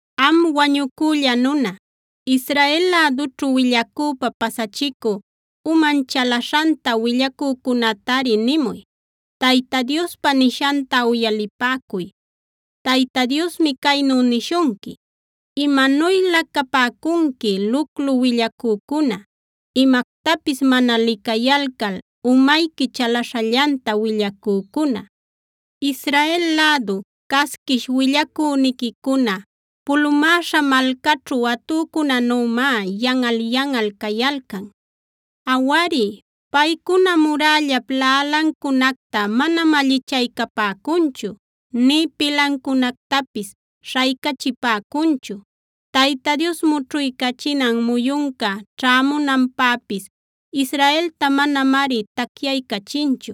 “Am wañucülla nuna, Israel lädućhu willacüpa pasachicü,a uman chalaśhanta willacücunätari nimuy: Tayta Diospa nishanta uyalipäcuy. Tayta Diosmi caynu nishunqui: Imanuylä capäcunqui, luclu willacücuna, imactapis mana licayalcal umayqui chalaśhallanta willacücuna. “Israel lädu, casquish willacüniquicuna pulumäśha malcaćhu atücunänümá yanꞌal-yanꞌal cayalcan. Awari, paycuna murällap laꞌalancunacta manam allichaycapäcunchu, nï pilancunactapis śhaycachipäcunchu. Tayta Dios mućhuycachinan muyunca ćhämunanpäpis Israelta manamari tacyaycachinchu.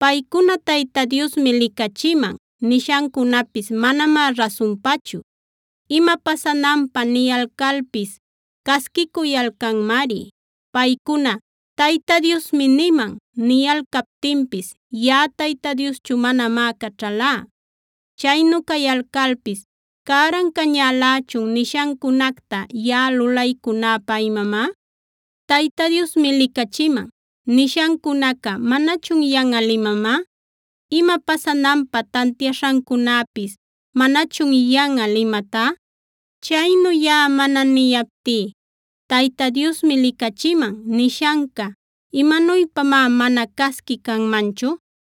Paycuna ‘Tayta Diosmi licachiman’ nishancunapis manamá rasunpachu. Ima pasananpä niyalcalpis casquicuyalcanmari. Paycuna ‘Tayta Diosmi niman’ niyalcaptinpis yaꞌa Tayta Dioschu manamá caćhalá. Chaynu cayalcalpis ¿cäran cañälächun nishancunacta yaꞌa lulaycunäpä imamá? ¿‘Tayta Diosmi licächiman’ nishancunaca manachun yanꞌal imamá? ¿Ima pasananpä tantiaśhancunäpis manachun yanꞌal imatá? Chaynu yaꞌa mana niyaptí ‘Tayta Diosmi licachiman’ nishanca ¿imanuypamá mana casqui canmanchu?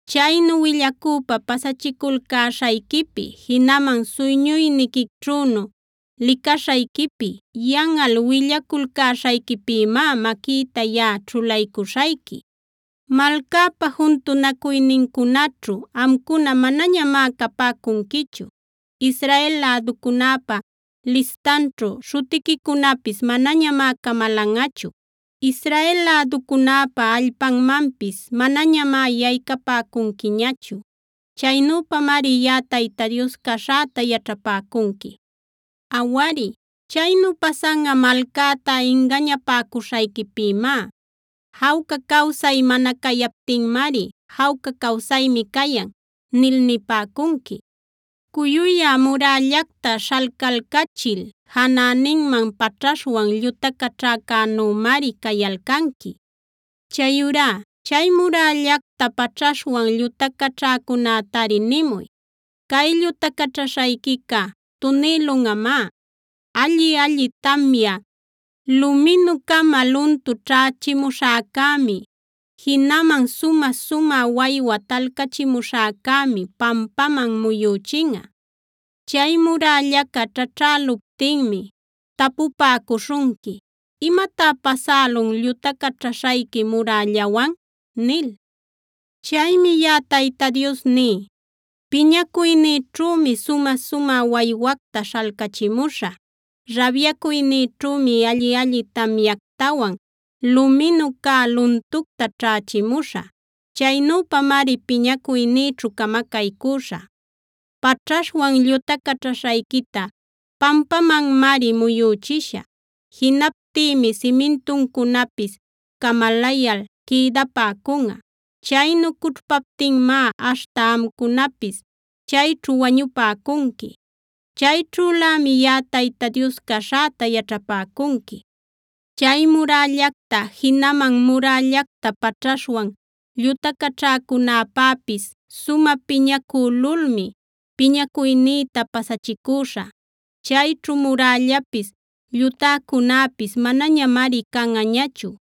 Chaynu willacüpa pasachiculcäśhayquipi, jinaman suyñuyniquićhünu licaśhayquipi yanꞌal willaculcäśhayquipïmá maquïta yaꞌa ćhulaycuśhayqui. Malcäpa juntunacuynincunaćhu amcuna manañamá capäcunquichu. Israel läducunäpa listanćhu śhutiquicunapis manañamá camalanꞌachu. Israel läducunäpa allpanmanpis manañamá yaycapäcunquiñachu. Chaynüpamari yaꞌa Tayta Dios caśhäta yaćhapäcunqui. “Awari, chaynu pasanꞌa malcäta ingañapäcuśhayquipïmá. Jawca cawsay mana cayaptinmari ‘Jawca cawsaymi cayan’ nil nipäcunqui.b Cuyuyä murällacta śhalcalcachil janäninman paćhaśhwan llutacaćhäcänümari cayalcanqui. Chayurá chay murällacta paćhaśhwan llutacaćhäcunätari nimuy: Cay llutacaćhaśhayquica tunïlunꞌamá. Alli-alli tamya, luminu-cama luntu ćhächimuśhäcämi, jinaman sumä-sumä waywa talcachimuśhäcämi pampaman muyüchinꞌa. Chay murällaca ćhaćhäluptinmi tapupäcuśhunqui: ‘¿Imatá pasälun llutacaćhaśhayqui murällawan?’ nil. “Chaymi yaꞌa Tayta Dios ní: Piñacuynïćhümi sumä-sumä waywacta śhalcachimuśhä; rabyacuynïćhümi alli-alli tamyactawan luminu cä luntucta ćhächimuśhä. Chaynüpamari piñacuynïćhu camacaycüśhä. Paćhaśhwan llutacaćhaśhayquita pampamanmari muyüchishä. Jinaptïmi simintuncunapis camalayal quïdapäcunꞌa. Chaynu cućhpaptinmá aśhta amcunapis chayćhu wañupäcunqui. Chayćhülämi yaꞌa Tayta Dios caśhäta yaćhapäcunqui. Chay murällacta jinaman murällacta paćhaśhwan llutacaćhäcunäpäpis sumä piñacülulmi piñacuynïta pasachicüśhä. Chayćhu murällapis, llutäcunäpis manañamari canꞌañachu.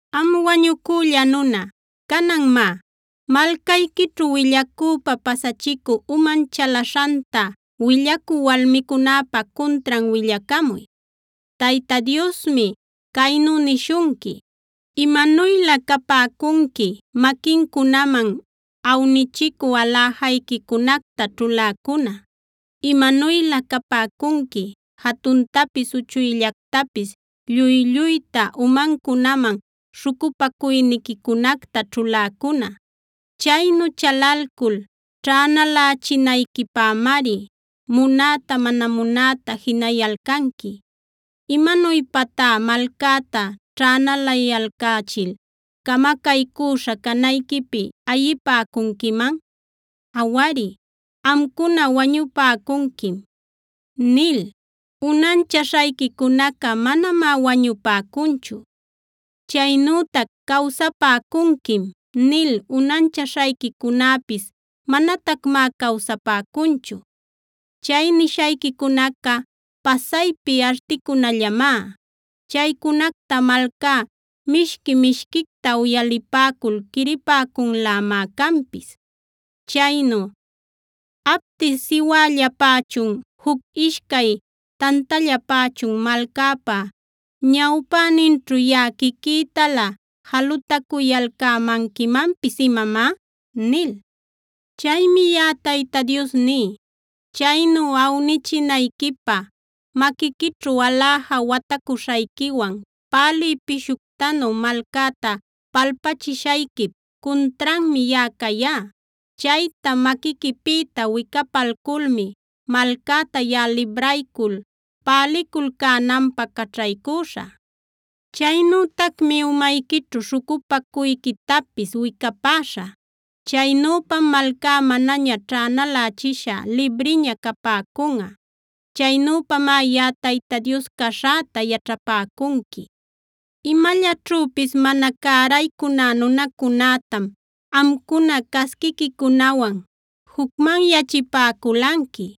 “Am wañucülla nuna, canan má, malcayquićhu willacüpa pasachicü uman chalaśhanta willacü walmicunäpa cuntran willacamuy. Tayta Diosmi caynu nishunqui: ‘¡Imanuylä capäcunqui maquincunaman awnichicü aläjayquicunacta ćhuläcuna! ¡Imanuylä capäcunqui jatuntapis uchuyllactapis lluy-lluyta umancunaman śhucupacuyniquicunacta ćhuläcuna! Chaynu chalalcul ćhänalächinayquipämari munäta mana munäta jinayalcanqui. ¿Imanuypatá malcäta ćhänalayalcächil camacaycüśha canayquipi ayipäcunquiman? Awari, amcuna “wañupäcunquim” nil unanchaśhayquicunaca manamá wañupäcunchu. Chaynütac “Cawsapäcunquim” nil unanchaśhayquicunäpis manatacmá cawsapäcunchu. Chay nishayquicunaca pasaypi articunallamá. Chaycunacta malcá mishqui-mishquicta uyalipäcul quiripäcunlämá canpis. Chaynu ¿apti siwällapächun, juc ishcay tantallapächun malcäpa ñawpäninćhu yaꞌa quiquïtalä jalutacuyalcämanquimanpis imamá?’ nil. “Chaymi yaꞌa Tayta Dios ní: Chaynu awnichinayquipä maquiquićhu aläja watacuśhayquiwan pälï pishuctanu malcäta palpachishayquip cuntranmi yaꞌa cayá. Chayta maquiquipïta wicapalculmi malcäta yaꞌa libraycul päliculcänanpä caćhaycüśhä. Chaynütacmi umayquićhu śhucupacuyquitapis wicapäśhä. Chaynüpam malcá manaña ćhänalächisha libriña capäcunꞌa. Chaynüpamá yaꞌa Tayta Dios caśhäta yaćhapäcunqui. Imallaćhüpis mana cäraycuná nunacunätam amcuna casquiquicunawan jucmanyachipäculanqui.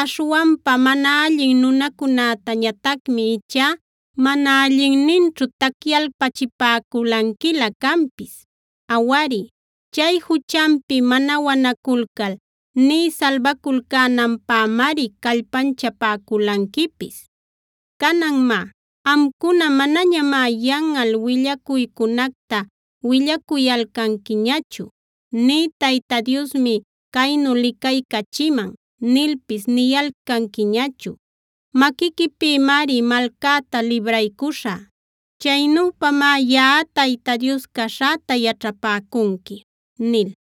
Aśhwanpa mana allin nunacunätañatacmi ichá mana allinninćhu tacyalpachipäculanquilä canpis. Awari, chay juchanpi mana wanaculcal nï salbaculcänanpämari callpanchapäculanquipis. Canan má, amcuna manañamá yanꞌal willacuycunacta willacuyalcanquiñachu, nï ‘Tayta Diosmi caynu licaycachiman’ nilpis niyalcanquiñachu. Maquiquipïmari malcäta libraycuśhä. Chaynüpamá yaꞌa Tayta Dios caśhäta yaćhapäcunqui” nil.